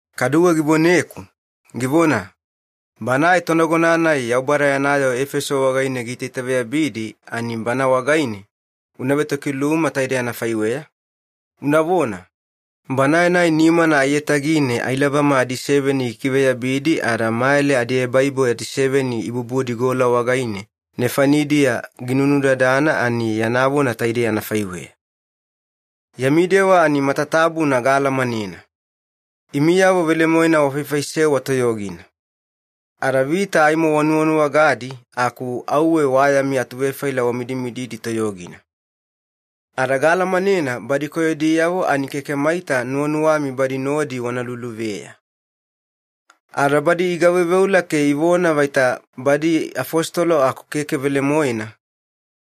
Kaduwe givoneku, givona, “Banae tonagona-nai Yaubada yana yoo Efeso wagaine giitaitaveyabidi ani bana wagaine una vetokiluma taide anafaiweya, unavona, ‘Banae-nai nimana aiyatagine ailabama adiseveni gikiveyabidi ada mayale adiebaibo adiseveni ibubudi gola wagaine nefanidiya ginudadana ani yana vona taidei anafaiweya. Yami dewa ani matatabuna gaalamanena. Imiyavo velemoena wafaifaisewa toyogina. Ada vita aimo wanuwanuwagadi, aku auwe wa yami atuvefaila wamidimididi toyogina. Ada gaalamanena badi koyodiyavo ani keke maita nuwanuwami badi nodi wana luluveya. Ada badi igaveuveula ke ivona vaita badi afositolo aku keke velemoena,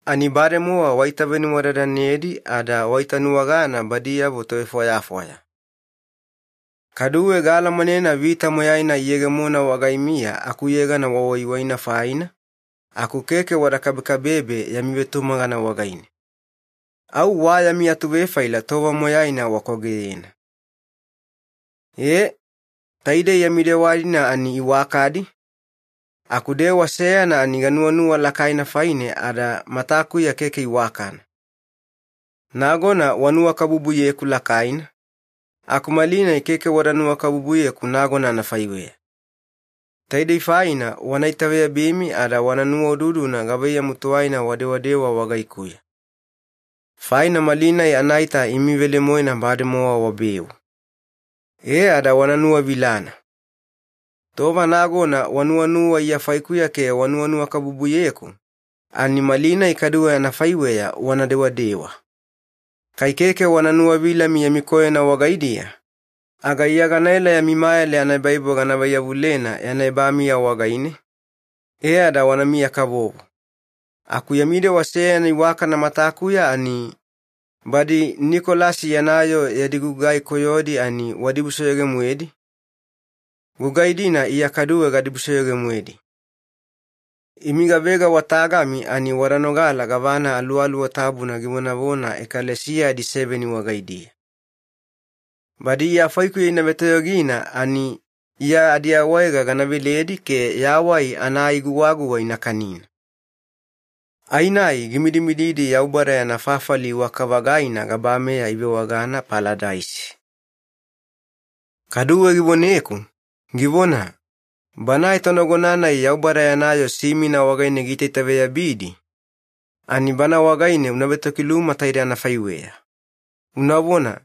ani bademowa waitavenuwadadanedi ada waitanuwagana badiyavo tovefwayafwaya. Kaduwe gaalamanena vita moyaina iyegemona wagaimiya akuyegana wawaiwaina faina, aku keke wada kabekabebe yami vetumagana wagaine. Au wa yami atuvefaila tova moyaina wakwageyena. Ee, taidei yami dewa-dina ani iwakadi, aku dewa seyana ani ganuwanuwa lakaina faine ada matakuya keke iwakana. Nagona wanuwakabubuyeku lakaina, aku malinai keke wada nuwakabubuyeku nagona anafaiweya. Taidei faina wana itaveyabimi ada wana nuwaududuna gavaiyamu tuwaina wadewadewa wagaikuya. Faina malinai anaita imi velemoena bademowa wabeu. E ada wana nuwavilana. Tova nagona wanuwanuwa Iya faikuya ke wanuwanuwakabubuyeku, ani malinai kaduwe anafaiweya wana dewadewa. Kai keke wana nuwavilami yami koyona wagaidiya, aga Iya ganaela yami mayale anaebaibo gana vaiyavulena yana ebamiya wagaine, e ada wanamiya-kavovo. Aku yami dewa seyana iwakana matakuya ani, badi Nikolasi yana yoo yadi gugai koyodi ani wadibusoyoge-moedi, gugai-dina Iya kaduwe gadibusoyoge-moedi. Imi gavega wa tagami ani wada nogala gavana Aluwaluwa Tabuna givonavona ekalesiya adiseveni wagaidiya. Badi Iya faikuya ina vetoyogina ani Iya adiawaega gana veledi ke yawai ana ai guwaguwa ina kanina. Ai-nai gimidimididi Yaubada yana fafali iwaka-vagaina gabameya ivewagana Paladaisi.’” Kaduwe givoneku, givona, “Banae tonagona-nai Yaubada yana yoo Simina wagaine giitaitaveyabidi, ani bana wagaine una vetokiluma taide anafaiweya, unavona,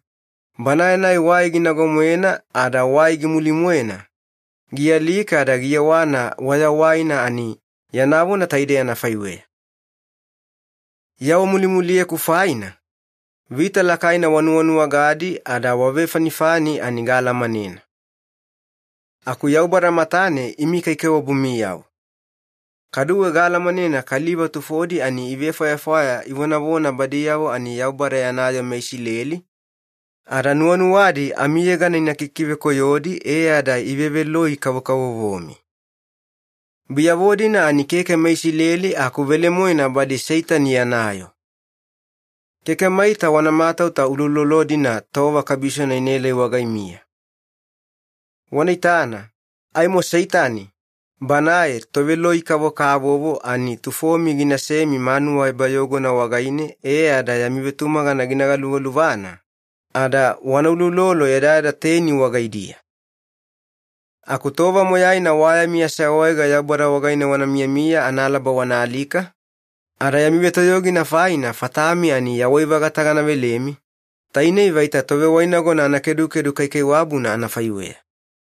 ‘Banae-nai wai ginago-moena ada wai gimuli-moena, gialika ada giyewana wayawaina ani yana vona taidei anafaiweya. Iya wamulimuliyeku faina, vita lakaina wanuwanuwagadi ada wavefanifani ani gaalamanena. Aku Yaubada matane imi kaikaiwabumiyavo. Kaduwe gaalamanena kaliva tufodi ani ivefwayafwaya ivonavona badiyavo ani Yaubada yana yoo meIsileli, ada nuwanuwadi amiyegana ina kikivekoyodi e ada iveveloi-kavokavovomi. Biyavo-dina ani keke meIsileli aku velemoena badi Seitani yana yoo. Keke maita wana matauta uloulolo-dina tova kabisona inaelai wagaimiya. Wana itana, aimo Seitani, banae toveloi-kavokavovo ani tufomi ginasemi manuwa ebayogona wagaine e ada yami vetumagana gina galuvaluvana, ada wana uloulolo yadayada teni wagaidiya. Aku tova moyaina wa yami aseawaega Yaubada wagaine wana miyamiya analaba wana alika, ada yami vetoyogina faina fatami ani yawai-vagata gana velemi, tainei vaita tovewainagona anakedukedu kaikaiwabuna anafaiweya.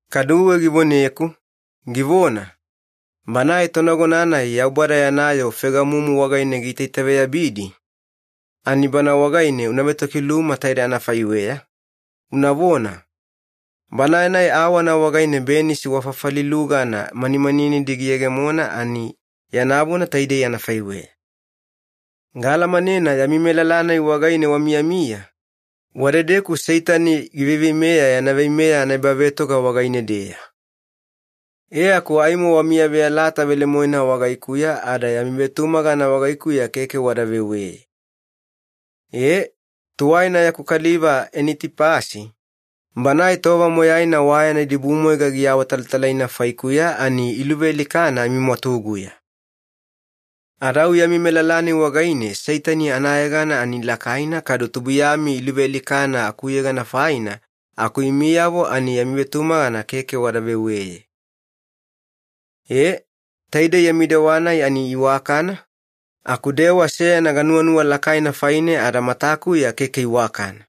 Kaduwe givoneku, givona, “Banae tonagona-nai Yaubada yana yoo Fegamumu wagaine giitaitaveyabidi, ani bana wagaine una vetokiluma taide anafaiweya, unavona, ‘Banae-nai awana wagaine benisi wa fafali lugana manimaninidi giyegemona ani yana vona taidei anafaiweya. Gaalamanena yami melala-nai wagaine wamiyamiya, wadedeku Seitani giveiveimeya yana veimeya anaebavetoga wagaine-deya. E aku aimo wamiyaveyalata velemoena wagaikuya ada yami vetumagana wagaikuya keke wada veweye. Ee, tuwaina yaku kaliva Enitipasi, banae tova moyaina wa yana idibumwaiga giawatalatalaina faikuya ani iluvealikana amimwatuguya. Ada au yami melala-nai wagaine Seitani anayegana ani lakaina kadu tubuiyami iluvealikana akuyegana faina, aku imiyavo ani yami vetumagana keke wada veweye. Ee, taidei yami dewa-nai ani iwakana, aku dewa seyana ganuwanuwa lakaina faine ada matakuya keke iwakana.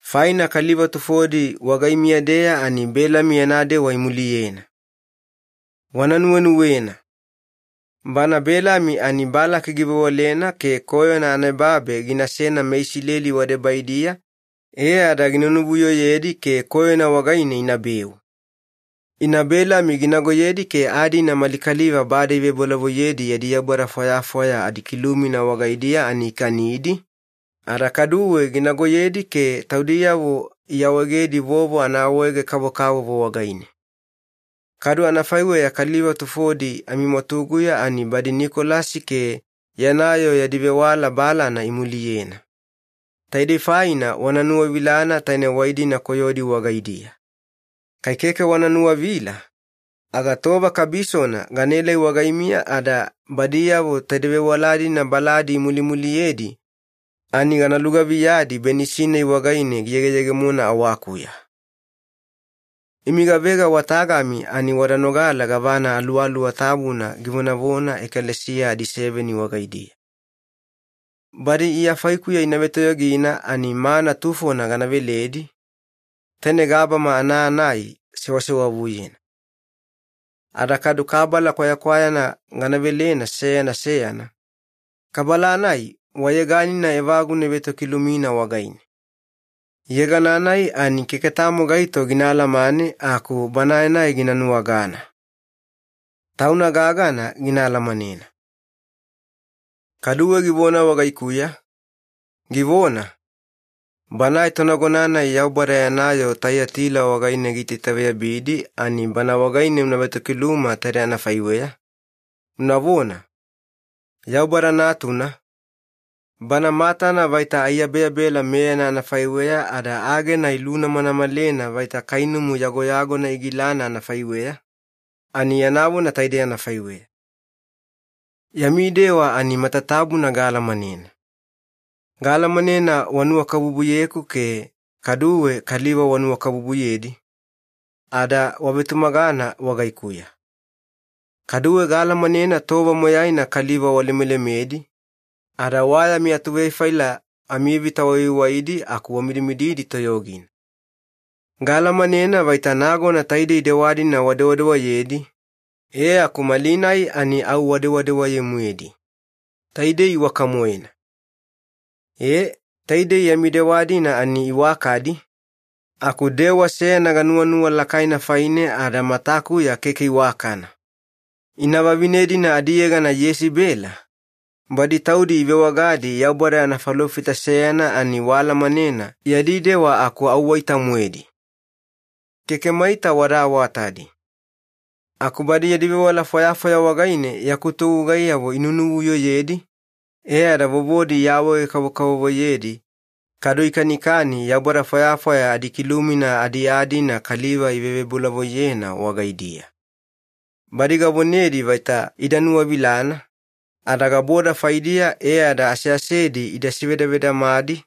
Faina kaliva tufodi wagaimiya-deya ani Belami yana dewa imuliyena. Wana nuwenuwena. Bana Belami ani Balaki givewalena ke koyona anaebabe ginasena meIsileli wadebaidiya, e ada gina nuvuyoyedi ke koyona wagaine inabeu. Ina Belami ginagoyedi ke aa-dina mali kaliva bade ivebolavoiyedi yadi yaubada fwayafwaya adikilumina wagaidiya ani ikanidi, ada kaduwe ginagoyedi ke taudiyavo iawaegedi vovo anaawaege-kavokavovo wagaine. Kadu anafaiweya kaliva tufodi amimwatuguya ani badi Nikolasi ke yana yoo yadi vewala balana imuliyena. Taidei faina wana nuwavilana taine wai-dina koyodi wagaidiya. Kai keke wana nuwavila, aga tova kabisona ganaelai wagaimiya ada badiyavo taide vewala-dina baladi imulimuliyedi, ani gana lugaviyadi benisi-nai wagaine giyegeyegemona awakuya. Imi gavega wa tagami ani wada nogala gavana Aluwaluwa Tabuna givonavona ekalesiya adiseveni wagaidiya. Badi Iya faikuya ina vetoyogina ani mana tufona gana veledi, taine gabama ana aa-nai sewasewavuyena. Ada kadu kabala kwayakwayana gana velena seyana seyana, kabala-nai wa yeganina evaguna ivetokilumina wagaine. Yegana-nai ani keke tamo gaito gina alamane aku banae-nai gina nuwagana. Tauna gagana gina alamanena.’” Kaduwe givona wagaikuya, givona, “Banae tonagona-nai Yaubada yana yoo Taiyatila wagaine giitaitaveyabidi, ani bana wagaine una vetokiluma taide anafaiweya, unavona, ‘Yaubada Natuna, Bana matana vaita aiyabeyabela meyana anafaiweya ada agena ilunamanamalena vaita kainumu yagoyagona igilana anafaiweya, ani yana vona taidei anafaiweya. Yami dewa ani matatabuna gaalamanena. Gaalamanena wanuwakabubuyeku ke kaduwe kaliva wanuwakabubuyedi, ada wavetumagana wagaikuya. Kaduwe gaalamanena tova moyaina kaliva walemelemedi, ada wa yami atuvefaila amivita wawaiwaidi aku wamidimididi toyogina. Gaalamanena vaita nagona taidei dewa-dina wadewadewayedi, e aku malinai ani au wadewadewaye-moedi. Taidei iwaka-moena. Ee, taidei yami dewa-dina ani iwakadi, aku dewa seyana ganuwanuwa lakaina faine ada matakuya keke iwakana. Ina vavine-dina adiyegana Yesibela, badi taudi ivewagadi Yaubada yana falofita seyana ani waalamanena yadi dewa aku au waita-moedi. Keke maita wada awatadi. Aku badi yadi vewala fwayafwaya wagaine yaku togugaiyavo inunuvuyoyedi, e ada vovodi iawaege-kavokavovoyedi, kadu ikanikani yaubada fwayafwaya adikilumina adiaa-dina kaliva ivebolavoiyena wagaidiya. Badi gavonedi vaita ida nuwavilana, ada gaboda faidiya e ada aseasedi ida sevedavedamadi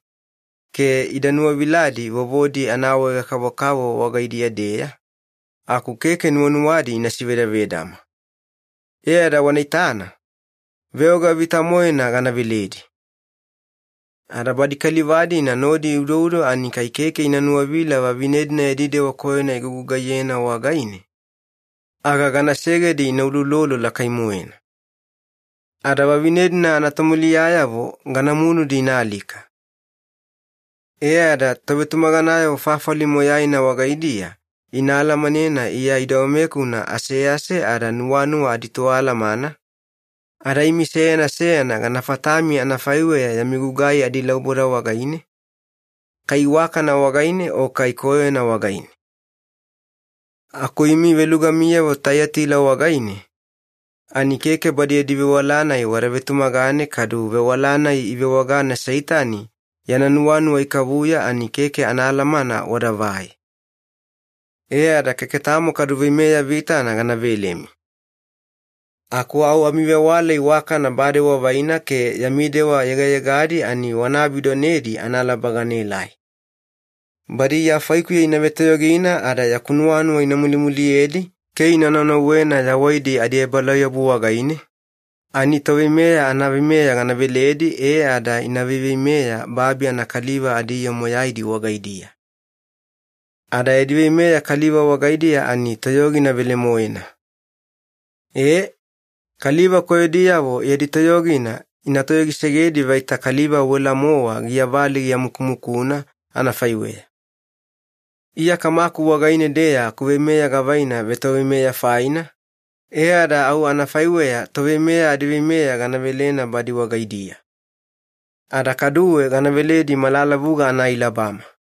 ke ida nuwaviladi vovodi anaawaega-kavokavovo wagaidiya-deya, aku keke nuwanuwadi ina sevedavedama. E ada wana itana, veoga vita-moena gana veledi. Ada badi kaliva-dina nodi iudoudo ani kai keke ina nuwavila vavine-dina yadi dewa koyona igugugaiyedi wagaine, aga gana segedi ina uloulolo lakai-moena. Ada vavine-dina anatomuliyayavo gana munudi ina alika. E ada tovetumaganayavo fafali moyaina wagaidiya ina alamanena Iya idogamekuna asease ada nuwanuwa aditoalamana, ada imi seyana seyana gana fatami anafaiweya yami gugai adilauboda wagaine, kai iwakana wagaine o kai koyona wagaine. ‘Aku imi velugamiyavo Taiyatila wagaine, ani keke badi yadi vewala-nai wada vetumagane kadu vewala-nai ivewagana ‘Seitani yana nuwanuwa ikavuya’ ani keke anaalamana wadavai. E ada keke tamo kadu veimeya vitana gana velemi. Aku au amivewala iwakana bade wavaina ke yami dewa yegayegadi ani wana abidonedi analaba ganaelai. Badi Iya faikuya ina vetoyogina ada yaku nuwanuwa ina mulimuliyedi ke ina naunauwena yawaidi adiebalauyabu wagaine, ani toveimeya anaveimeya gana veledi e ada ina veiveimeya babi anakaliva adiyoo moyaidi wagaidiya. Ada yadi veimeya kaliva wagaidiya ani toyogina velemoena. Ee, kaliva koyodiyavo yadi toyogina ina toyogisegedi vaita kaliva wela-mowa giyavali giamukumukuna anafaiweya. Iya Kamaku wagaine-deya akuveimeya gavaina vetoveimeya faina, e ada au anafaiweya toveimeya adiveimeya gana velena badi wagaidiya. Ada kaduwe gana veledi malalavuga anaailabama.